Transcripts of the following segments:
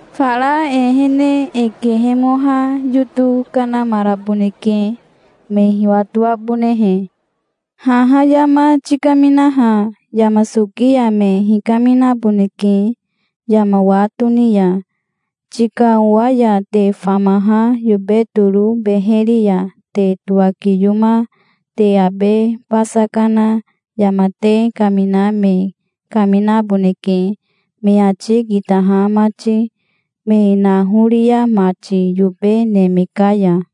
Fara e ehene e kehemoha yoto kanamaraboneke, me hiwatoabonehe. Haha yama tikaminaha yama soki ya me hikaminaboneke yama wa toni ya. Tika owa ya te famaha yobe toro beheri ya te towakiyoma te abe basa kana yama te kamina me kaminaboneke me ati kitaha mati, me naoria mati yobe neme ka ya".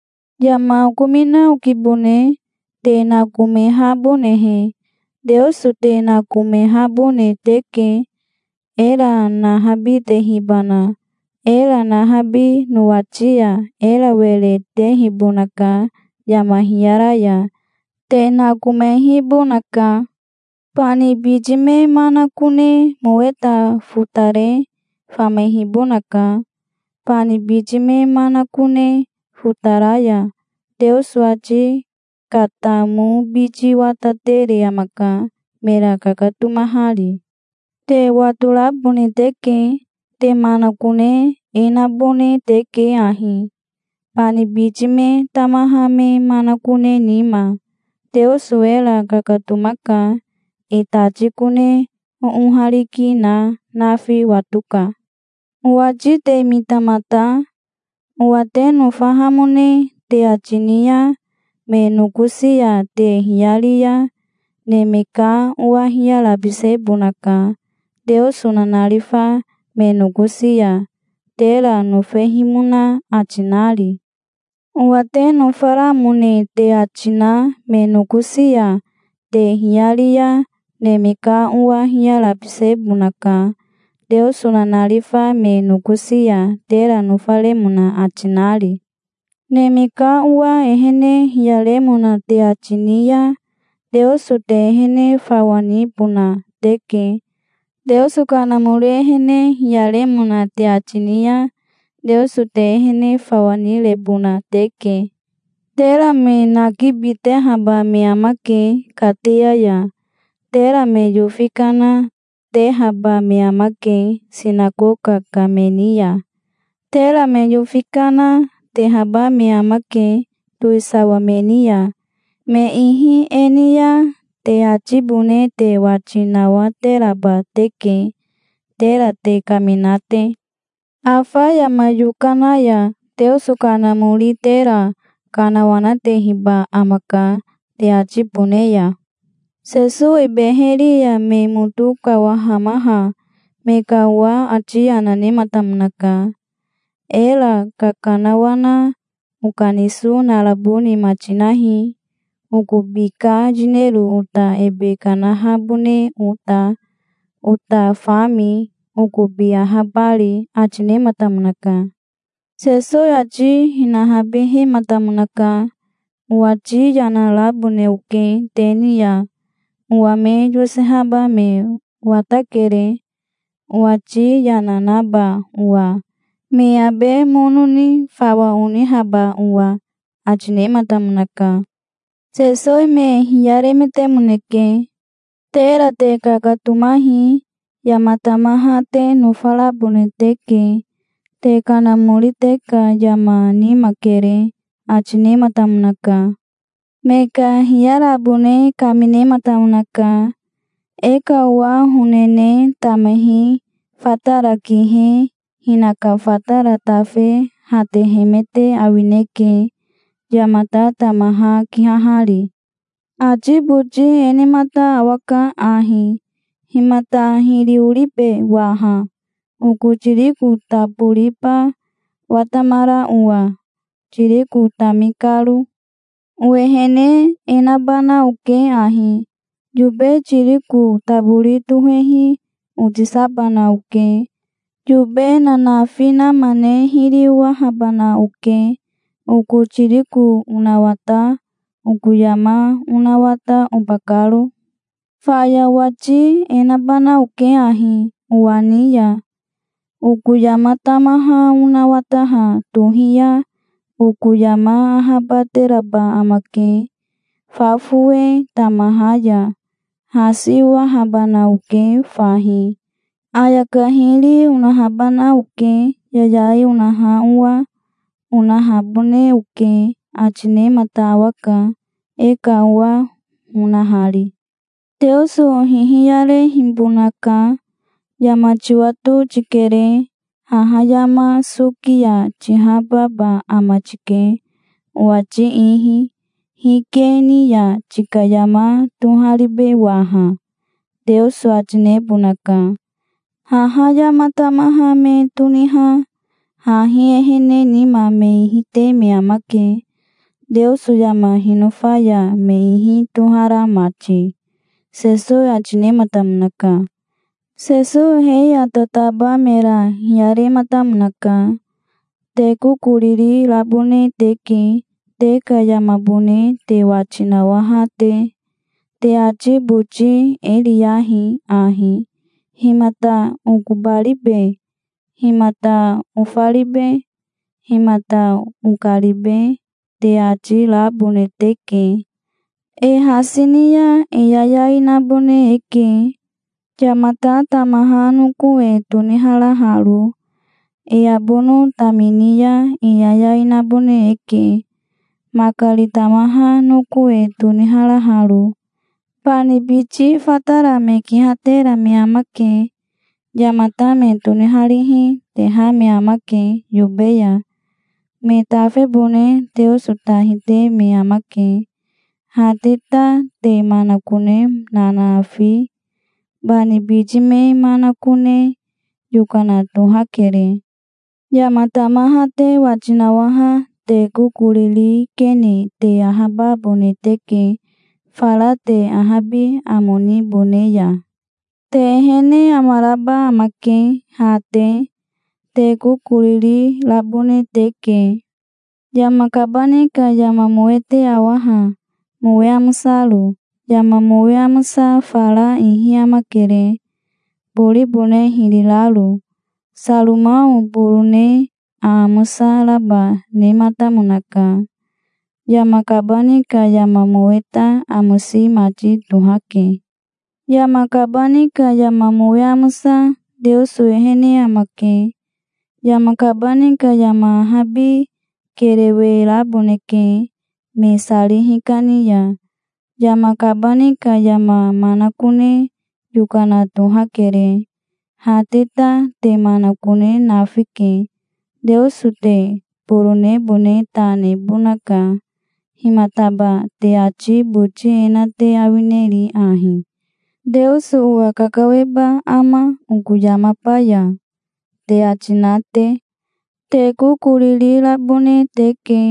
Yama okomina okibone, te nakomehabonehe. Teoso te nakomehabone teke, era nahabitehibana. Era nahabi nowati ya era were tehibonaka yama hiyara ya. Te nakomehibonaka. Bani biti me manakone moweta fotare famehibonaka. Bani biti me manakone fotara ya Teoso ati katamobiti watatere amaka, mera kakatomahari. Te watorabone teke. Te manakone e nabone teke ahi, bani biti me tamaha me manakone nima. Teoso era kakatomaka. E tati kone oohariki na nafi watoka". "Owati te mita mata. Owa te nofahamone te ati ni ya me nokosi ya te hiyari ya Neme ka Owa hiyarabisebonaka Teoso nanarifa me nokosi ya, tera nofehimona ati nari. Owa te nofaramone te ati na me nokosi ya te hiyari ya Neme ka Owa hiyarabisebonaka, Teoso nanarifa me nokosi ya tera nofaremona ati nari. Neme ka Owa ehene hiyaremona te ati ni ya Teoso te ehene fawa nibona teke. Teoso Kanamori ehene hiyaremona te ati ni ya Teoso te ehene fawa nirebona teke. Tera me nakibitehaba me amake kateya ya. Tera me yofi kana, tehaba me amake sinakoka ka me ni ya. Tera me yofi kana, tehaba me amake towisawa me ni ya. Me ihi e ni ya te atibone te wati nawateraba teke, tera te kamina te. Afa yama yokana ya Teoso Kanamori tera kanawanatehiba amaka, te atibone ya". Sesowi beheri ya me moto kawahamaha me ka owa ati yana nematamonaka. "Era kakanawana okaniso narabo nima tinahi, okobi ka yinero ota ebe kanahabone ota, ota fami, okobi ahabari", ati nematamonaka. Sesowi ati hinahabihematamonaka. "Owati yana rabone oke te ni ya. Owa me yosehaba me watakere, owati yana naba owa, me abe mono ni fawa onihaba owa", ati nematamonaka. Sesowi me hiyaremetemoneke. "Tera te kakatomahi. Yama tamaha te nofarabone teke. Te kanamori te ka yama nima kere", ati nematamonaka. Me ka hiyarabone kaminematamonaka. "E ka owa honene tamahi fatara kihe hinaka fatara tafe hatehemete awineke, yamata tamaha kihahari. Ati boti e nemata awaka ahi: 'Himata hiri oribe waha, oko tiriko taboriba watamara owa, tiriko tami karo? Owehene e nabana oke ahi: yobe tiriko tabori tohehi otisabana oke. Yobe nanafi nama ne hiri owahabana oke, oko tiriko onawata, oko yama onawata, oba karo. Faya owati e nabana oke ahi owa ni ya. Oko yama tamaha onawataha tohi ya oko yama ahabateraba amake, fa fowe tamaha ya. Hasi owahabana oke fahi. Ayaka hiri onahabana oke, yayai onaha owa, onahabone oke', ati nemata awaka, e ka owa honahari". "Teoso hihiyarehibonaka. 'Yama tiwato tikere. Haha yama soki ya tihababa ama tike, owati ihi. Hike ni ya tika yama toharibe waha?' Teoso ati nebonaka. Haha yama tamaha me toniha hahi ehene nima me ihi te me amake, Teoso yama hinofa ya me ihi tohara mati", Sesowi ati nematamonaka. Sesowi he ya tataba mera hiyarematamonaka. "Te kokoriri rabone teke, te ka yamabone te wati nawaha te. Te ati boti e riyahi ahi: 'Himata okobaribe? Himata ofaribe? Himata okaribe?' te ati rabone teke. E hasi ni ya e yayai nabone eke, yamata tamaha noko e toniharaharo. E abono tamini ya e yayai nabone eke, makari tamaha noko e toniharaharo. Bani biti fatara me kihatera me amake. Yamata me toniharihi, teha me amake yobe ya. Me tafebone Teoso ta hite me amake. Ha te ta te manakone nanafi, bani biti me manakone yokana tohakere. Yama tamaha te wati nawaha te kokoriri kene te ahababone teke fara te ahabi amo nibone ya. Te ehene amaraba amake, ha te. Te kokoriri rabone teke. Yama kabani ka yama mowe te awa ha, mowe amosaro. Yama mowe amosa fara ihi amakere, boribone hiri raro. Saromao borone aamosa raba nematamonaka. Yama kabani ka yama mowe ta amosi mati tohake. Yama kabani ka yama mowe amosa Teoso ehene amake. Yama kabani ka yama ahabi kerewe raboneke, me sari hikani ya. Yama kabani ka yama manakone yokana tohakere. Ha te ta te manakone nafike. Teoso te boronebone ta nebonaka. Himataba te ati boti e na te awineri ahi: 'Teoso owa kakaweba ama oko yamaba ya?' te ati na te? Te kokoriri rabone teke,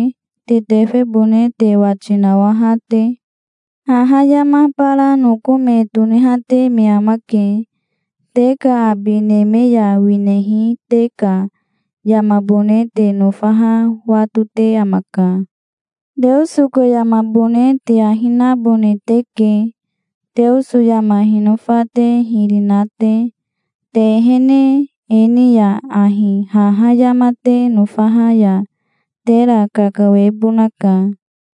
te tefebone te wati nawaha te. Haha yama bara noko me tonihate me amake. Te ka abi neme ya winehi te ka yamabone te nofaha watote amaka. Teoso ka yamabone te ahi nabone teke, Teoso yama hinofa te hiri na te. Te ehene e ni ya ahi haha yama te nofaha ya tera kakawebonaka.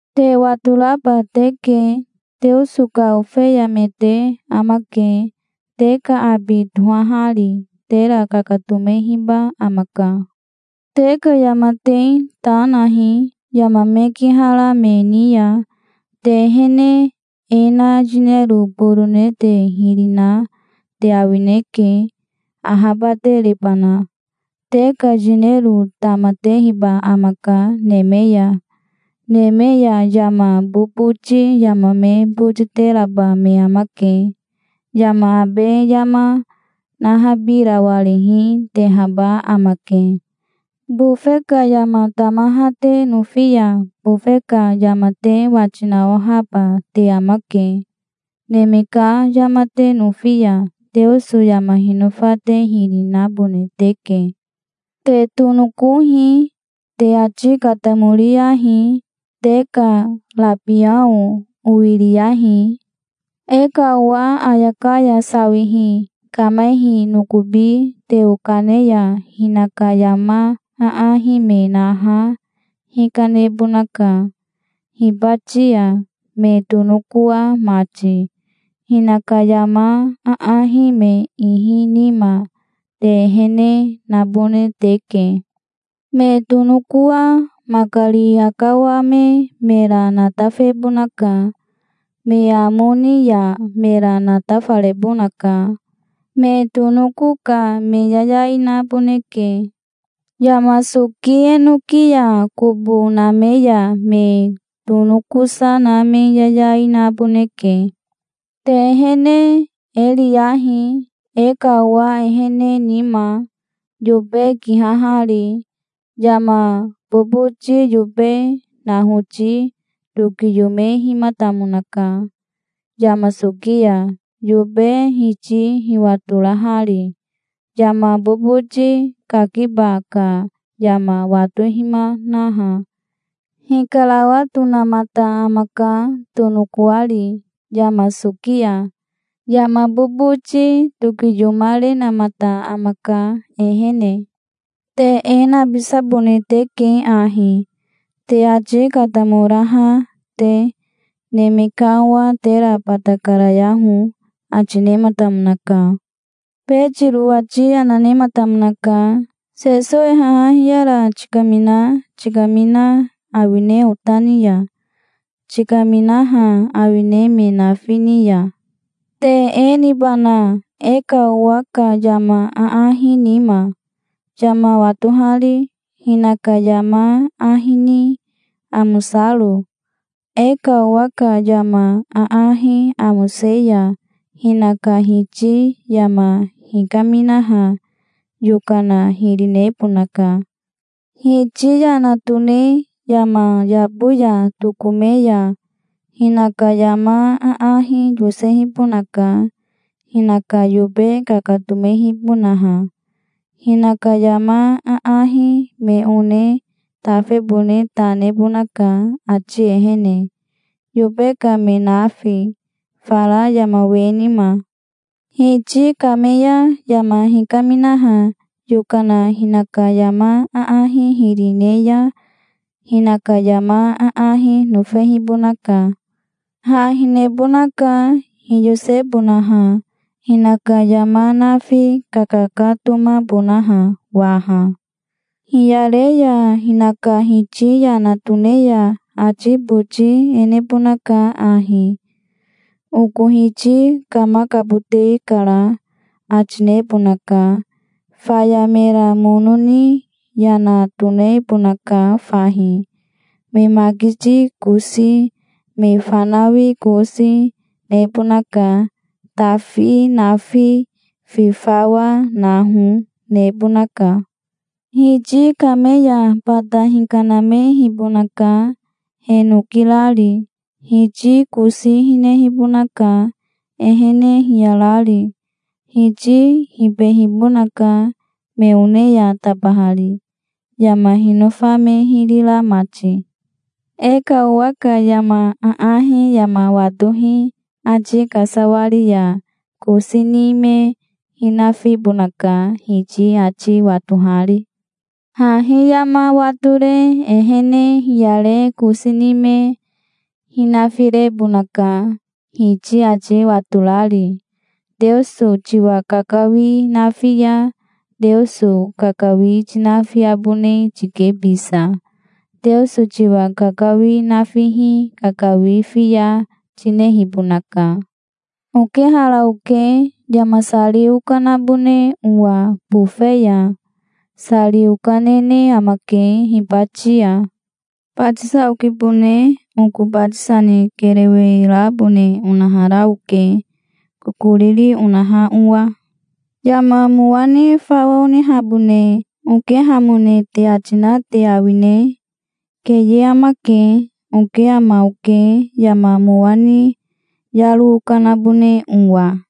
Te watoraba teke. Teoso ka ofeya me te amake, te ka abi tohahari. Tera kakatomehiba amaka. Te ka yama te ta nahi, yama me kihara me ni ya. Te ehene e na yinero borone te hiri na te awineke, ahabaterebana. Te ka yinero tamatehiba amaka neme ya. Neme ya yama boboti yama me botiteraba me amake. Yama abe yama nahabirawarihi, tehaba amake. Bofe ka yama tamaha te nofi ya bofe ka yama te wati nawahaba te amake. Neme ka yama te nofi ya Teoso yama hinofa te hiri nabone teke". "Te tonokohi. Te ati katamoriyahi. Te ka rabiao owiriyahi. E ka owa ayaka ya sawihi kamehi nokobi teo kane ya hinaka yama aahi me naha hikanebonaka, hibati ya, me tonokoa mati. Hinaka yama aahi me ihi nima, te ehene nabone teke. Me tonokoa makari akawame mera natafebonaka. Me amo ni ya mera natafarebonaka. Me tonoko ka me yayai naboneke. Yama soki enoki ya kobo name ya me tonokosa na me yayai naboneke". "Te ehene e riyahi, e ka owa ehene nima, yobe kihahari. Yama boboti yobe nahoti tokiyomehimatamonaka yama soki ya, yobe hiti hiwatorahari. Yama boboti kakiba ka yama watohimanaha, hikarawatonamata amaka, tonokoari, yama soki ya. Yama boboti tokiyomarenamata amaka, ehene. Te e nabisabone teke ahi, te ati katamoraha te. Neme ka Owa tera bata karayaho", ati nematamonaka. Betiro ati yana nematamonaka. " Sesowi haha hiyara tikamina tikamina awine ota ni ya? Tikaminaha awine me nafi ni ya?" "Te e nibana, e ka owa ka yama aahi nima, yama watohari, hinaka yama ahi ni amosaro? E ka owa ka yama aahi amose ya hinaka hiti yama hikaminaha yokana hiri nebonaka. Hiti yana tone yama yabo ya tokome ya hinaka yama aahi yosehibonaka, hinaka yobe kakatomehibonaha. Hinaka yama aahi me one tafebone ta nebonaka ati ehene, yobe ka me nafi, fara yama we nima. Hiti kame ya yama hikaminaha yokana hinaka yama aahi hiri ne ya, hinaka yama aahi nofehibonaka. Ha hinehibonaka, hiyosebonaha, hinaka yama nafi kakakatomabonaha waha. Hiyare ya hinaka hiti yana tone ya ati boti e nebonaka ahi: 'Oko hiti kamakabote kara', ati nebonaka. Faya mera mono ni yana tokanebonaka fahi. Me makiti kosi, me fanawi kosi, nebonaka. Tafi nafi, fi fawa, hano, nebonaka. Hiti kame ya bata hikanamehibonaka, he noki rari. Hiti kosi hinehibonaka, ehene hiyarari. Hiti hibehibonaka, me one ya tabahari, yama hinofa me hiri ra mati". "E ka owa ka yama aahi yama watohi ati kasawari ya kosi ni me hinafibonaka, hiti ati watohari. Hahi yama watore ehene hiyare kosi ni me hinafirebonaka, hiti ati watorari. Teoso tiwa kakawi nafi ya Teoso kakawi tinafiabone tike bisa. Teoso tiwa kakawi nafihi kakawi fiya tinehibonaka". "Okehara oke, yama sari onahabone owa bofe ya. Sari okanene amake hibati ya. Batisa okibone. Oko batisa ni kerewe rabone onahara oke, kokoriri onaha owa. Yama mowa ni fawa onihabone okehamone te ati na te awine? Keye amake. Oke ama oke, yama mowa ni yaro okanabone owa.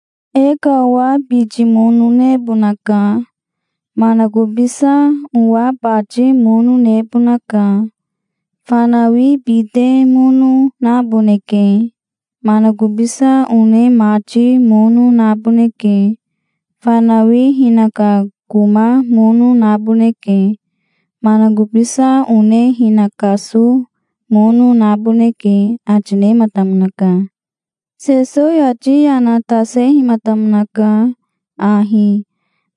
E ka owa biti mono nebonaka. Manakobisa owa bati mono nebonaka. Fanawi bite mono naboneke. Manakobisa one mati mono naboneke. Fanawi hinaka koma mono naboneke. Manakobisa one hinakaso mono naboneke", ati nematamonaka. Sesowi ati yana tasehimatamonaka ahi,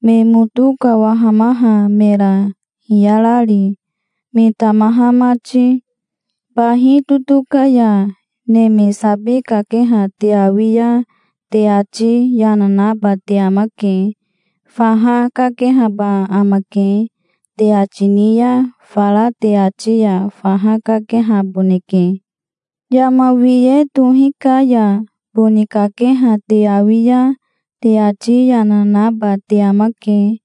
me moto kawahamaha mera hiyarari, me tamaha mati. "Bahi totoka ya neme sabi kakeha te awi ya te ati yana naba te amake. 'Faha kakehaba amake', te ati ni ya fara te ati ya faha kakehaboneke. Yama hiwe tohi ka ya boni kakeha te awi ya te ati yana naba te amake.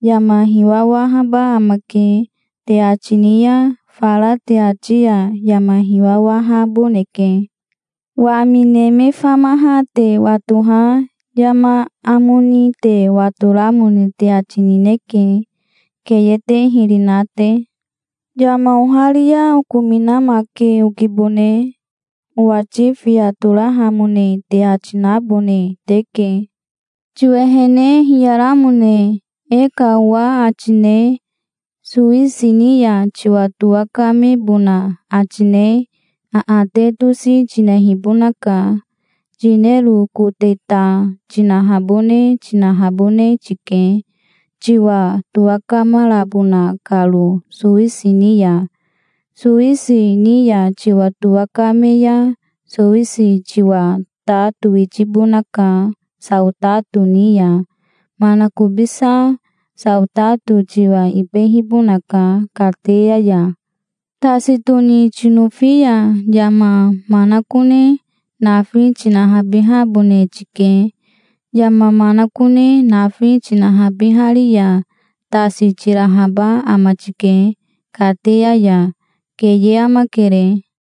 'Yama hiwawahaba amake', te ati ni ya fara te ati ya yama hiwawahaboneke. Wami neme famaha te watoha yama amo ni te watoramone te ati nineke, keye te hiri na te". "Yama oharia okominamake okibone. Owati fiya torahamone te ati nabone teke. Tiwehene hiyaramone e ka owa ati ne sowisi ni ya tiwa towakamebona ati ne aate tosi tinehibonaka. Yinero kote ta tinahabone tinahabone tike, tiwa towakamarabona karo sowisi ni ya. Sowisi ni ya tiwa towakame ya sowisi tiwa ta towitibonaka saotato ni ya. Manakobisa saotato tiwa ibehibonaka kateya ya. Tasi toni tinofi ya yama manakone nafi tinahabihabone tike. Yama manakone nafi tinahabihari ya tasi tirahaba ama tike kateya ya. Keye amakere".